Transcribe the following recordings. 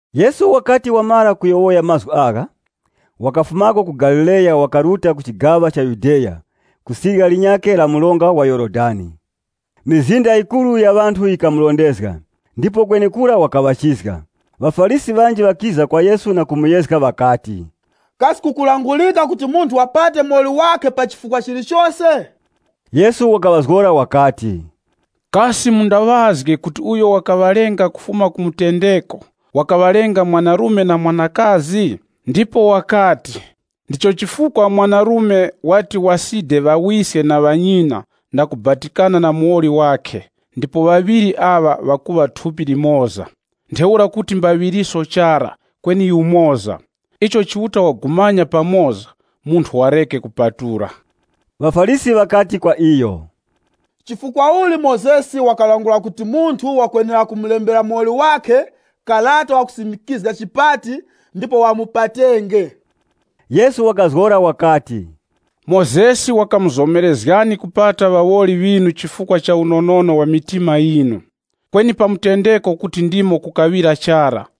Yesu wakati wamara kuyowoya mazgu agha, wakafumako ku Galileya wakaruta ku chigaŵa cha Yudeya ku sirya linyakhe la mronga wa Yorodani. Mizinda yikuru ya ŵanthu yikamurondezga, ndipo kwenekura wakaŵachizga. ŴaFarisi ŵanji ŵakiza kwa Yesu na kumuyezga, ŵakati, “Kasi kukulangurika kuti munthu wapate muwoli wakhe pa chifukwa chilichose?” Yesu wakaŵazgora wakati, “Kasi mundaŵazge kuti uyo wakaŵalenga kufuma ku mutendeko, wakaŵalenga mwanarume na mwanakazi? Ndipo wakati, ‘Ndicho chifukwa mwanarume wati waside ŵawiske na ŵanyina na kubatikana na muwoli wakhe, ndipo ŵaŵiri aŵa ŵakuŵa thupi limoza.’ Ntheura kuti mbaŵiriso chara, kweni yumoza. Icho Chiuta wagumanya pamoza, munthu wareke kupatula.” ŴaFarisi ŵakati kwa iyo, “Chifukwa uli Mozesi wakalangula kuti munthu wakwenera kumulembera muwoli wakhe karata wa chipati, ndipo wamupatenge?” Yesu wakazgora wakati, “Mozesi wakamuzomerezgani kupata ŵawoli ŵinu chifukwa cha unonono wa mitima yinu. Kweni pa mutendeko kuti ndimo kukaŵira chara.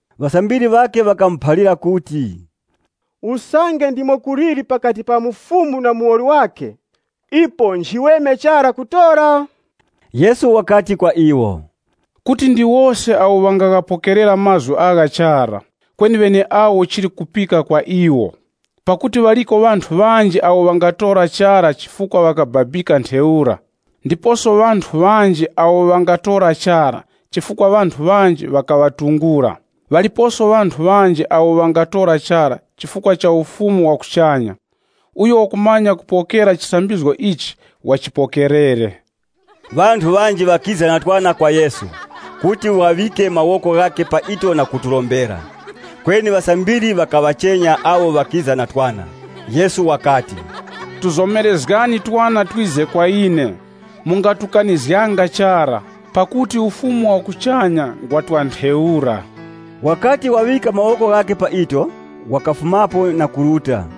Ŵasambiri ŵakhe ŵakamuphalira kuti, “Usange ndimo kuliri pakati pa mufumu na muwoli wakhe, ipo nchiweme chara kutora.” Yesu wakati kwa iwo, “Kuti ndi wose awo ŵangaghapokerera mazgu agha chara, kweni ŵeneawo chili kupika kwa iwo. Pakuti ŵaliko ŵanthu ŵanji awo ŵangatora chara chifukwa ŵakababika ntheura, ndiposo ŵanthu ŵanji awo ŵangatora chara chifukwa ŵanthu ŵanji ŵakaŵatungula. Ŵaliposo ŵanthu ŵanji awo ŵangatora chara chifukwa cha Ufumu wa kuchanya. Uyo wakumanya kupokera chisambizgo ichi, wachipokerere.” Ŵanthu ŵanji ŵakiza na twana kwa Yesu kuti waŵike mawoko ghakhe pa ito na kuturombera. Kweni ŵasambiri ŵakaŵachenya awo ŵakiza na twana. Yesu wakati, “Tuzomerezgani twana twize kwa ine, mungatukanizganga chara. Pakuti Ufumu wa kuchanya ngwa twa ntheura.” Wakati waŵika mawoko ghakhe pa ito, wakafumapo na kuruta.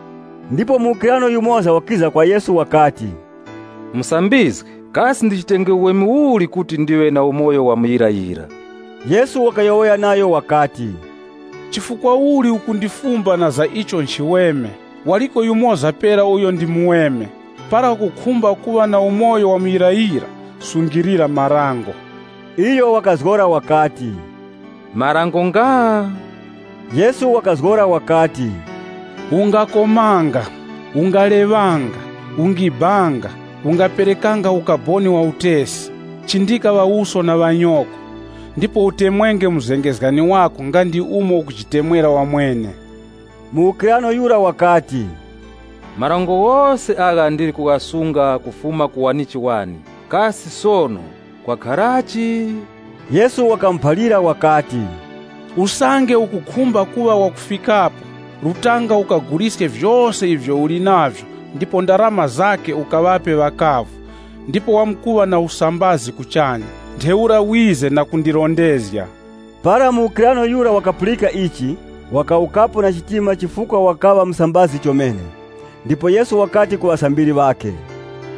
Ndipo muwukirano yumoza wakiza kwa Yesu wakati, “Musambizgi! Kasi ndichitenge uweme uli kuti ndiŵe na umoyo wa muyirayira?” Yesu wakayowoya nayo wakati, “Chifukwa uli ukundifumba na za icho nchiweme? Waliko yumoza pera uyo ndi muweme. Para ukukhumba kuŵa na umoyo wa muyirayira, sungilira marango.” Iyo wakazgora wakati, “Marango nga?” Yesu wakazgora wakati, “Ungakomanga, Ungaleŵanga, Ungibanga, Ungaŵanga kaboni wa utesi, Chindika ŵawuso na ŵanyoko, ndipo Utemwenge muzengezgani wako nga ndi umo ukujitemwera wamwene.” Muwukirano yura wakati, “Marango ghose agha ndili kughasunga kufuma ku wanichi wane, kasi sono kwakharachi?” Yesu wakamuphalira wakati, “Usange ukukhumba kuŵa wakufikapo, rutanga ukaguliske vyose ivyo uli navyo ndipo ndarama zakhe ukaŵape ŵakavu, ndipo wamkuŵa na usambazi kuchanya. Ntheura ŵize na kundirondezga.” Para muwukirano yura wakapulika ichi, wakawukapo na chitima chifukwa wakaŵa musambazi chomene. Ndipo Yesu wakati ku ŵasambiri ŵakhe,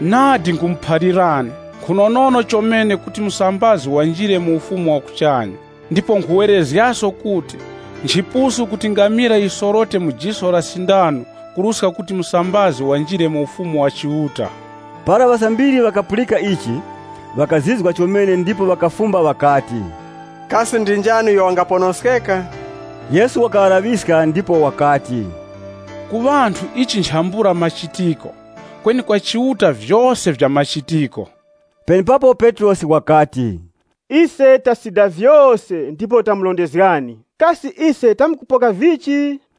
“Nadi nkhumuphalirani, nkhunonono chomene kuti musambazi wanjire mu Ufumu wa kuchanya. Ndipo nkhuwerezgaso kuti, nchipusu kuti ngamila yisorote mu jiso la sindano kuruska kuti musambazi wanjire mu Ufumu wa Chiuta.” Para ŵasambiri ŵakapulika ichi, ŵakazizwa chomene ndipo ŵakafumba ŵakati, “Kasi ndi njani uyo wangaponoskeka?” Yesu wakaŵalaŵiska ndipo wakati, “Ku ŵanthu ichi nchambula machitiko, kweni kwa Chiuta vyose vya machitiko.” Penepapo Petrosi wakati, “Ise tasida vyose ndipo tamurondezgani! Kasi ise tamkupoka vichi?”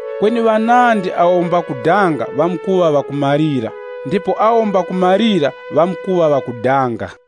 Kweni ŵanandi awo mbakudanga ŵamkuŵa ŵakumalira, ndipo awo mbakumalira ŵamkuŵa ŵakudanga.”